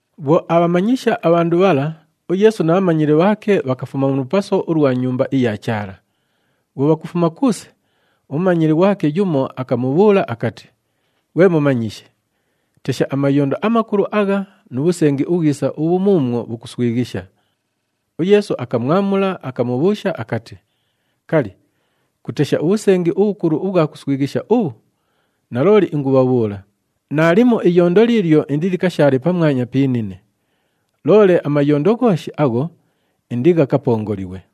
Bhwo aabhamanyisha abhandu bhala, uYeesu na bhamanyili bhaake bhakafuma mu lupaso ulwa Nyumba iya Chaala. Bhwo bhakufuma kuuse, umumanyili ghwake yumo akamubhuula akati, “Ghwe Mumanyishi, tesha, amayondo amakulu agha nu bhusengi ubhwisa ubhu muumwo bhukuswighisha!” UYeesu akamwamula, akamubhuusha akati, “Kali, kutesha ubhusengi ubhukulu ubhwa kuswighisha ubhu? Nalooli ingubhabhuula, naalimo iyondo liilyo indilikashaale pamwanya pi inine. Loole amayondo ghooshi agho, indighakapongolighwe!”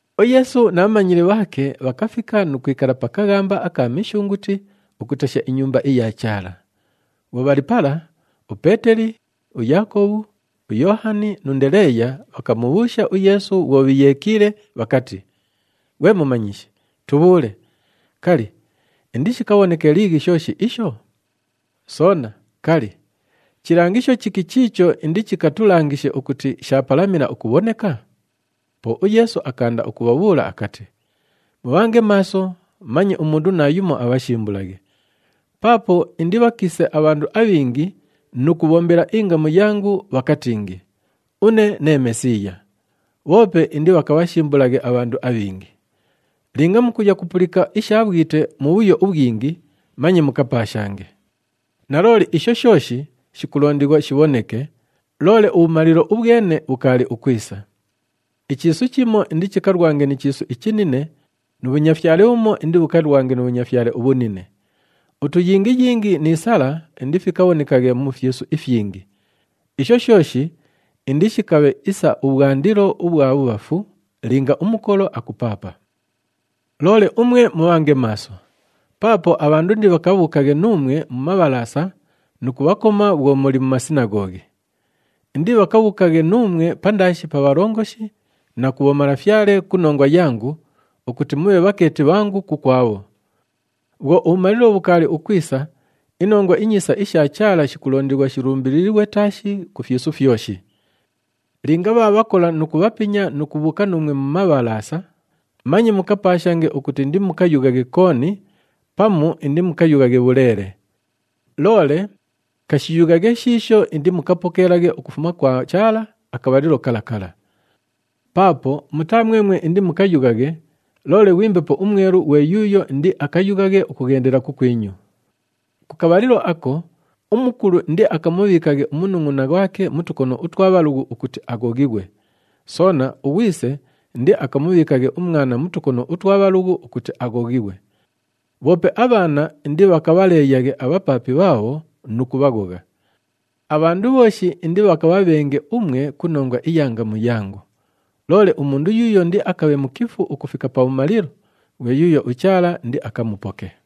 UYeesu na bhamanyili bhaake bhakafika nu kwikala pa kaghamba aka Mishunguti ukutesha iNyumba iya Chaala. Bhwo bhali pala, uPeeteli, uYaakobhu, uYoohani nu Ndeleeya bhakamubhuusha uYeesu bhwo bhiiyeekiile, bhakati, “Ghwe Mumanyishi, tubhuule, kali, indishikabhoneke liighi shooshi isho? Soona, kali, chilangisho chiki chiicho indichikatulangishe ukuti shaapalamila ukubhoneka?” Po uYeesu akaanda ukubhabhuula akati, “Mubhange maaso, manye umundu naayumo abhashimbulaghe. Paapo indibhakiise abhandu abhingi nu kubhombela ingamu yangu, bhakatingi, ‘Une nee Mesiiya.’ Bhoope indibhakabhashimbulaghe abhandu abhingi. Linga mukuya kupulika isha bhwite mubhuyo ubhwingi, manye mukapaashange. Nalooli, isho shooshi shikulondighwa shibhoneke, loole ubhumalilo ubhwene bhukaali bhukwisa. Ichiisu chimo indichikalwange ni chiisu ichinine nu bhunyafyale bhumo indibhukalwange nu bhunyafyale ubhunine. Utuyingiyingi ni sala indifikabhonekaghe mu fyisu ifyingi. Isho shooshi indishikabhe isa ubhwandilo ubhwa bhubhafu linga umukolo akupaapa. “Loole umwe mubhange maaso. Paapo abhandu indibhakabhuukaghe nuumwe mu mabhalaasa nu kubhakoma bhwo muli mu masinaghoghi. Indibhakabhuukaghe nuumwe pandaashi pa bhalongoshi na ku bhomalafyale ku nongwa yangu ukuti mubhe bhakeeti bhangu kukwabho. Bhwo ubhumalilo bhukaali ukwisa, iNongwa iNyiisa isha Chaala shikulondighwa shilumbililighwe taashi ku fyisu fyoshi. Linga bhaabhakola nu kubhapinya nu kubhuuka nuumwe mu mabhalaasa, manye mukapaashange ukuti indimukayughaghe kooni, pamu indimukayughaghe bhuleele. Loole kashiyughaghe shiisho indimukapokeelaghe ukufuma kwa Chaala akabhalilo kala kala. Paapo mutaa mwemwe indimukayughaghe, loole ghwi Mbepo uMwelu ghwe yuuyo indiakayughaghe ukughendela kukwinyu. Ku kabhalilo ako, umukulu indiakamubhiikaghe umunungʼuna ghwake mu tukono utwa bhalughu ukuti aghoghighwe. Soona, ughwise indiakamubhiikaghe umwana mu tukono utwa bhalughu ukuti aghoghighwe. Bhoope abhaana indibhakabhaleeyaghe abhapaapi bhaabho nu kubhaghogha. Abhandu bhooshi indibhakabhabhenge umwe ku nongwa iya ngamu yangu. Loole umundu yuuyo indiakabhe mukifu ukufika pabhumalilo, ghwe yuuyo uChaala indiakamupoke.”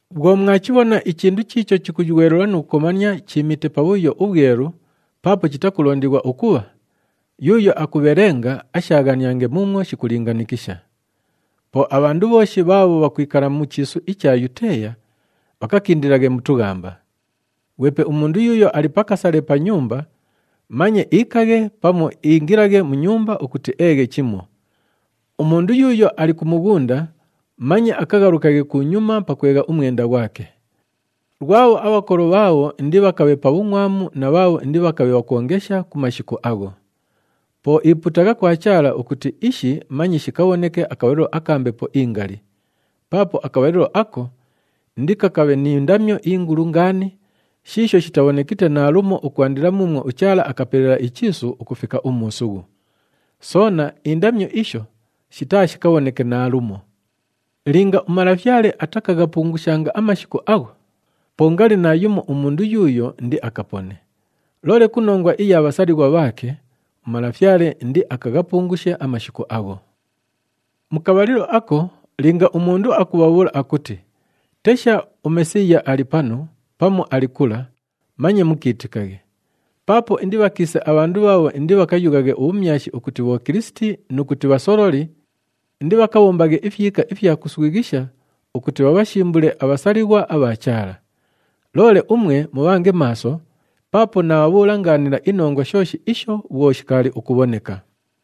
“Bhwo mwachibhona ‘ichindu chiicho chikuywelula nu kukomania,’ chiimite Pabhuyo uBhwelu paapo chitakulondighwa ukubha, (yuuyo akubhelenga ashaaghaniange muumwo shikulingaanikisha). Po abhandu bhooshi bhaabho bhakwikala mu chiisu icha Yuteeya bhakakindilaghe mu tughamba. Ghwepe umundu yuuyo ali pa kasale pa nyumba, manye iikaghe pamu iingilaghe mu nyumba ukuti eeghe chimo. Umundu yuuyo ali ku mughunda, manye akaghalukaghe kunyuma pakwegha umwenda ghwake. Lwabho abhakolo bhaabho indibhakabhe pa bhungʼwamu na bhaabho indibhakabhe bhakwongesha ku mashiku agho! Po ipuutagha kwa Chaala ukuti ishi manye shikabhoneke akabhalilo aka mbepo ingali. Paapo akabhalilo ako, indikakabhe ni ndamyo ingulu ngaani shiisho shitabhonekite naalumo ukwandila muumwo uChaala akapelela ichiisu ukufika umuusughu. Soona, indamyo isho shitaashikabhoneke naalumo. Linga uMalafyale atakaghapungushanga amashiku agho, po ngali naayumo umundu yuuyo indiakapone. Loole ku nongwa iya bhasalighwa bhaake, uMalafyale indiakaghapungushe amashiku agho. “Mu kabhalilo ako, linga umundu akubhabhuula akuti, ‘Tesha, uMesiiya ali panu,’ pamu, ‘Ali kula,’ manye mukiitikaghe. Paapo indibhakiise abhandu bhaabho indibhakayughaghe ubhumyashi ukuti bhokilisiti nu kuti bhasololi, indibhakabhombaghe ifyika ifya kuswighisha ukuti bhabhashimbule abhasalighwa abha Chaala. Loole umwe mubhange maaso, paapo naabhabhuula ngaanila inongwa shooshi isho bhwo shikaali ukubhoneka.”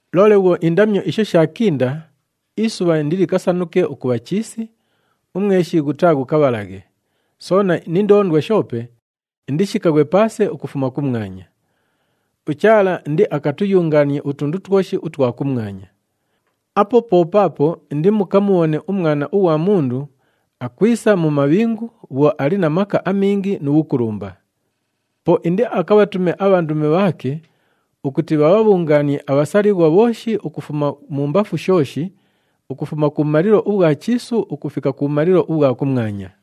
“Loole bhwo indamyo isho shaakinda, ‘Isubha indilikasanuke ukubha chiisi, umweshi ghutaaghukabhalaghe, soona ni ndoondwa shoope indishikaghwe paase ukufuma kumwanya. UChaala indiakatuyungaanie utundu twoshi utwa kumwanya.’ “Apo po paapo indibhakamubhone uMwana ughwa Mundu akwisa mu mabhingu bhwo ali na maka amingi nu bhukulumba. Po indiakabhatume abhandumi bhaake ukuti bhabhabhungaanie abhasalighwa bhooshi ukufuma mumbafu shooshi, ukufuma kubhumalilo ubhwa chiisu ukufika kubhumalilo ubhwa kumwanya.”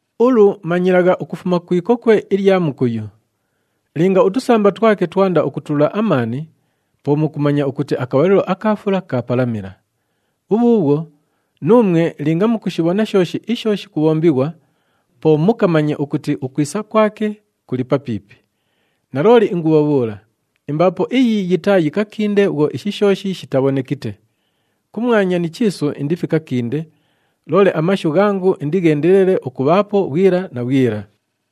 “Ulu manyilagha ukufuma ku ikokwe ilya mukuyu. Linga utusamba twake twanda ukutulula amaani, po mukumanya ukuti akabhalilo aka fula kaapalamila. Bhubhuubhwo, nuumwe linga mukushibhona shooshi isho shikubhombighwa, po mukamanye ukuti ukwisa kwake kuli papiipi. Nalooli ingubhabhuula, imbaapo iyi yitaayikakinde bhwo ishi shooshi shitabhonekite. Kumwanya ni chiisu indifikakinde, loole amashu ghangu indigheendelele ukubhaapo bhwila na bhwila.”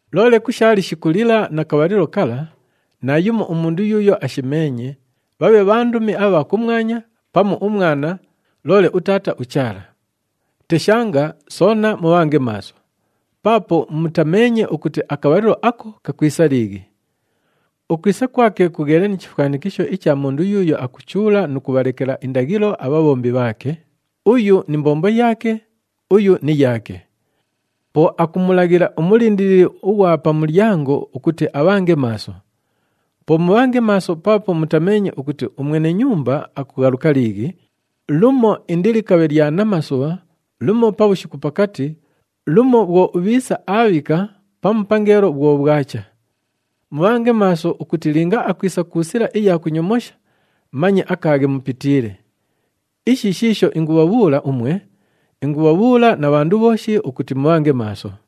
“Loole ku sha lishiku lila na kabhalilo kala, naayumo umundu yuuyo ashimeenye, bhabhe bhandumi abha kumwanya pamu uMwana, loole uTaata uChaala. Teshanga soona mubhange maaso! Paapo mutameenye ukuti akabhalilo ako kakwisa liighi. Ukwisa kwake kugheliile ni chifwanikisho icha mundu yuuyo akuchuula nu kubhalekela indaghilo abhabhombi bhaake, uyu ni mbombo yaake, uyu ni yaake. Po akumulaghila umulindilili ughwa pa mulyango ukuti abhange maaso. Po mubhange maaso paapo mutameenye ukuti umwene nyumba akughaluka liighi, lumo indilikabhe lya namasubha, lumo pabhushiku pakati, lumo bhwo ubhiisa aabhika pamu pangeelo bhwo bhwacha. Mubhange maaso ukuti linga akwisa ku sila iya kunyomosha, manye akaaghe mupitiile. Ishi shiisho ingubhabhuula umwe, ingubhabhuula na bhandu bhooshi ukuti mubhange maaso!”